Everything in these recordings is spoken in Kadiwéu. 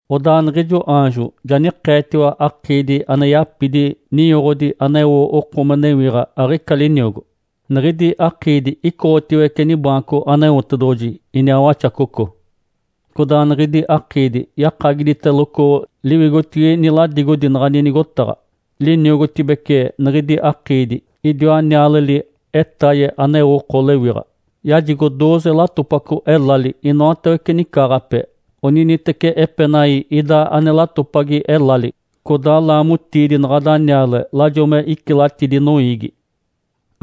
Odaa niɡ̶ijo aanjo ja nikeetiwa akiidi ane yapidi ninyoɡ̶odi aneo oko me newiɡ̶a aɡ̶ica liniogo. Niɡ̶idi akiidi icoɡ̶otiwece nibaanco Aneotedoɡ̶oji iniaa Waxacoco. Codaa niɡ̶idi akiidi yakagiditeloco liwigotigi niladigodi naɡ̶ani nigotaɡ̶a. Liniogotibece niɡ̶idi akiidi, idiwa nialeli etaye aneo oko lewiɡ̶a. Yajigo dooze latopaco elali inoatawece nicaaɡ̶ape, oniniteci epenai ida ane latopagi elali. Codaa laamotiidi naɡ̶ada niale lajo me icilatidi noiigi.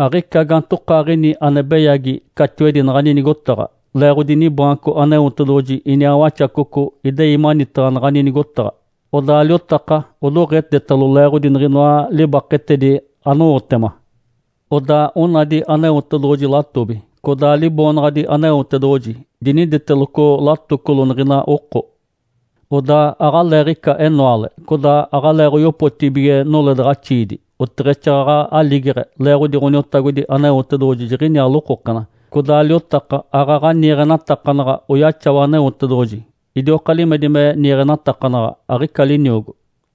Aɡ̶ica gaantokaaɡ̶ini ane beyagi catiwedi naɡ̶ani nigotaɡ̶a. Leeɡ̶odi nibaanco Aneotedoɡ̶oji iniaa Waxacoco idei manitaɡ̶a naɡ̶ani nigotaɡ̶a. Odaa liotaka odoɡ̶etetalo leeɡ̶odi niɡ̶inoa libaketedi anowotema. Odaa onadi Aneotedoɡ̶oji latobi, codaa Liboonaɡ̶adi Aneotedoɡ̶oji diniditeloco latocolo niɡ̶ina oko. Odaa aɡ̶aleeɡ̶ica enoale, codaa aɡ̶aleeɡ̶oyopotibige noledaɡ̶axiidi oteɡ̶exaaɡ̶aɡ̶a aligeɡ̶e, leeɡ̶odi Ǥoniotagodi Aneotedoɡ̶oji jiɡ̶iniaa lokokena. Codaa liotaka aaɡ̶aɡ̶a niiɡ̶enatakanaɡ̶a oyaxawa Aneotedoɡ̶oji. Idioka limedi me niiɡ̶enatakanaɡ̶a, aɡ̶ica liniogo.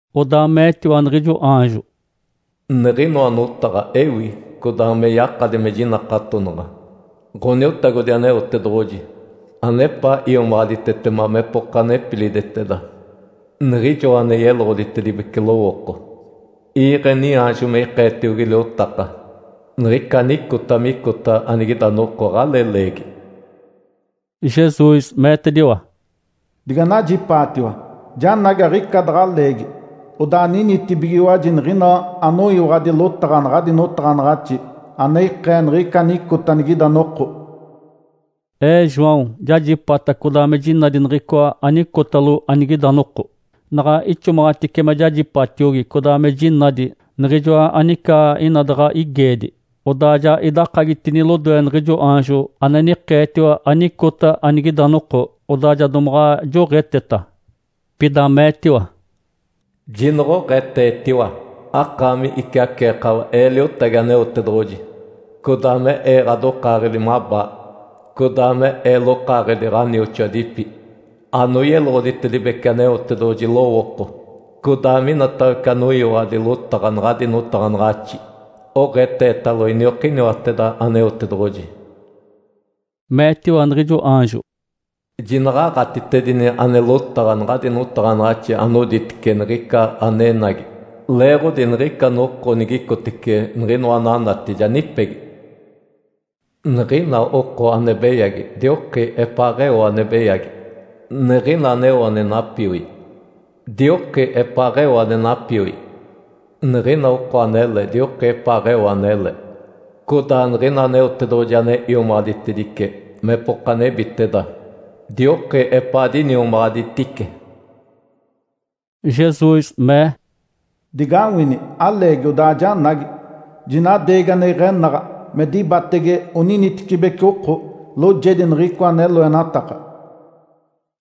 Odaa meetiwa niɡ̶ijo aanjo, “Niɡ̶inoa notaɡ̶a ewi, codaa me yakadi me jinakatonaɡ̶a. Ǥoniotagodi Aneotedoɡ̶oji, anepaa iomaɡ̶aditetema mepoka nepiliditeda niɡ̶ijo ane yeloɡ̶oditedibece lowooko, iiɡ̶e niaanjo me ikeetiogi liotaka niɡ̶ica anicota micota anigida noko aɡ̶alee leegi.” Jesus meetediwa, “Diganajipaatiwa! Janagi aɡ̶ica daɡ̶a leegi. Odaa ninitibigiwaji niɡ̶ina anoyiwaɡ̶adi lotaɡ̶a naɡ̶adi notaɡ̶anaɡ̶axi ane ikee niɡ̶ica anicota anigida noko.” Ee João jajipata codaa me jinadi niɡ̶icoa anicotalo anigida noko. Naɡ̶a ixomaɡ̶atice me jajipatiogi codaa me jinadi niɡ̶ijoa anica ina daɡ̶a igeedi, odaa ja idakagitini lodoe niɡ̶ijo aanjo ane nikeetiwa anicota anigida noko, odaa ja domaɡ̶a joɡ̶eteta. Pida meetiwa, “Jinoɡ̶oɡ̶eetetiwa, akaami iciaceekawa ee liotagi Aneotedoɡ̶oji, codaa me ee ɡ̶adokaaɡ̶edi mabaa, codaa me ee lokaaɡ̶edi ɡ̶anioxoadipi anoyeloɡ̶oditedibece Aneotedoɡ̶oji lowooko, codaa minatawece anoyiwaɡ̶adi lotaɡ̶a naɡ̶adi notaɡ̶anaɡ̶axi. Oɡ̶eetetalo iniokiniwateda Aneotedoɡ̶oji!” Meetiwa niɡ̶ijo aanjo, “Jinaɡ̶aɡ̶atitedini ane lotaɡ̶a naɡ̶adi notaɡ̶anaɡ̶axi anoditece niɡ̶ica anenagi, leeɡ̶odi niɡ̶ica noko nigicotece niɡ̶inoa ananati ja nipegi. Niɡ̶ina oko ane beyagi, dioki epaaɡ̶eo ane beyagi, niɡ̶ina aneo ane napioi, dioki epaaɡ̶eo ane napioi. Niɡ̶ina oko anele, dioki epaaɡ̶eo anele, codaa niɡ̶ina Aneotedoɡ̶oji ane iomaɡ̶aditedice mepoka nebiteda, dioki epaa diniomaɡ̶aditice.” Jesus mee, “Digawini! Aleegi odaa janagi. Jinadeegi ane iɡ̶enaɡ̶a me dibatege oninitecibeci oko, loojedi niɡ̶icoa ane loenataka.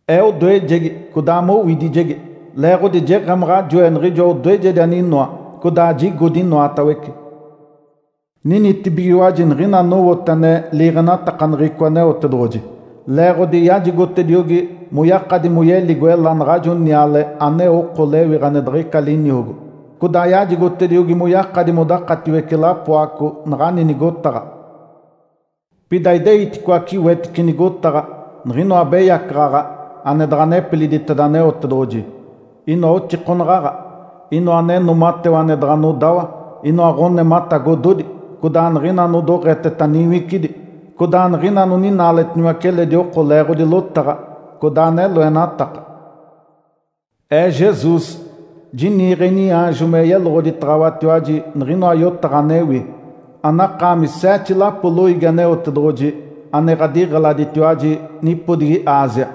Ee odoejegi codaa mowidijegi. Leeɡ̶odi jeɡ̶emaɡ̶a joe niɡ̶ijoa odoejedi aninoa, codaa jigodi inoatawece. Ninitibigiwaji niɡ̶ina anowote ane liiɡ̶enatakaneɡ̶eco Aneotedoɡ̶oji, leeɡ̶odi yajigotediogi moyakadi moyeligo ela naɡ̶ajo niale aneo oko lewiɡ̶a ane diɡ̶ica liniogo, codaa yajigotediogi moyakadi modakatiwece lapoaco naɡ̶ani nigotaɡ̶a. Pida ideiticoace wetice nigotaɡ̶a, niɡ̶inoa abeyacaɡ̶aɡ̶a ane daɡ̶a nepiliditeda Aneotedoɡ̶oji, inoa oxikonaɡ̶aɡ̶a, inoa ane noomatewa ane daɡ̶a nodawa, inoa ɡ̶onematagododi, codaa niɡ̶ina anodoɡ̶eteta niwicidi, codaa niɡ̶ina anoninaaletiniwace eledi oko leeɡ̶odi lotaɡ̶a codaa ane loenataka. Ee Jesus, jiniiɡ̶e iniaanjo me yeloɡ̶oditaɡ̶awatiwaji niɡ̶inoa yotaɡ̶a anewi, anakaami seete lapo loiigi Aneotedoɡ̶oji ane ɡ̶adiɡ̶eladitiwaji nipodigi Ásia.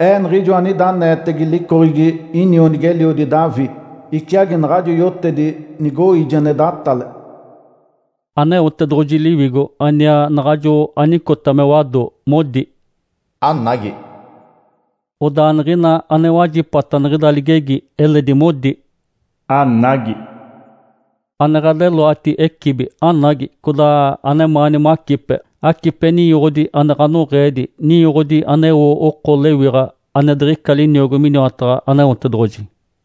Ee Niɡ̶ijoa anida aneetege licoɡ̶egi inionigi-eliodi Davi. Iciagi naɡ̶ajo yotedi nigoiije ane datale.” Aneotedoɡ̶oji Liwigo aniaa naɡ̶ajo anicota me wado modi, “Anagi!” Odaa niɡ̶ina anowajipata niɡ̶ida ligegi eledi modi, “Anagi!” Ane ɡ̶adeloati ecibi, anagi! Codaa anemaani macipe, acipe ninyoɡ̶odi ane ɡ̶anoɡ̶eedi, ninyoɡ̶odi aneo oko lewiɡ̶a ane diɡ̶ica liniogo miniwataɡ̶a Aneotedoɡ̶oji!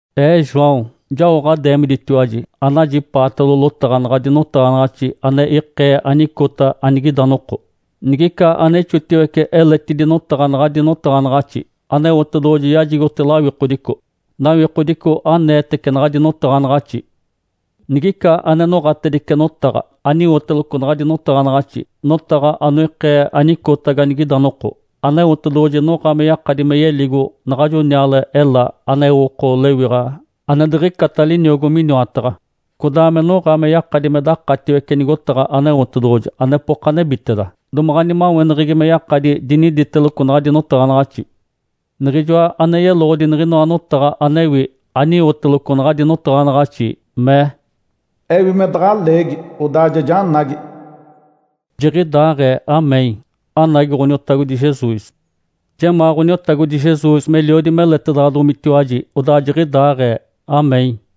Ee João jao ɡ̶adeemiditiwaji anajipaatalo lotaɡ̶a naɡ̶adi notaɡ̶anaɡ̶axi ane ikee anicota anigida noko. Nigica ane ixotiwece eletidi notaɡ̶a naɡ̶adi notaɡ̶anaɡ̶axi, Aneotedoɡ̶oji yajigote lawikodico, nawikodico aneetece naɡ̶adi notaɡ̶anaɡ̶axi. Nigica ane noɡ̶atedice notaɡ̶a aniwoteloco naɡ̶adi notaɡ̶anaɡ̶axi, notaɡ̶a anoikee anicota ganigida noko, Aneotedoɡ̶oji noɡ̶a me yakadi me yeligo naɡ̶ajo niale ela aneo oko lewiɡ̶a ane diɡ̶icata liniogo miniwataɡ̶a, codaa me noɡ̶a me yakadi me dakatiwece nigotaɡ̶a Aneotedoɡ̶oji anepoka nebiteda, domaɡ̶a nimaweneɡ̶egi me yakadi diniditeloco naɡ̶adi notaɡ̶anaɡ̶axi. Niɡ̶ijoa ane yeloɡ̶odi niɡ̶inoa notaɡ̶a anewi aniwoteloco naɡ̶adi notaɡ̶anaɡ̶axi mee, “Ewi me daɡ̶a leegi, odaa ja janagi.” Jiɡ̶idaaɡ̶ee! (Amém). Anagi Ǥoniotagodi Jesus! Jemaa Ǥoniotagodi Jesus meliodi meletedaɡ̶adomitiwaji. Odaa jiɡ̶idaaɡ̶ee! (Amém).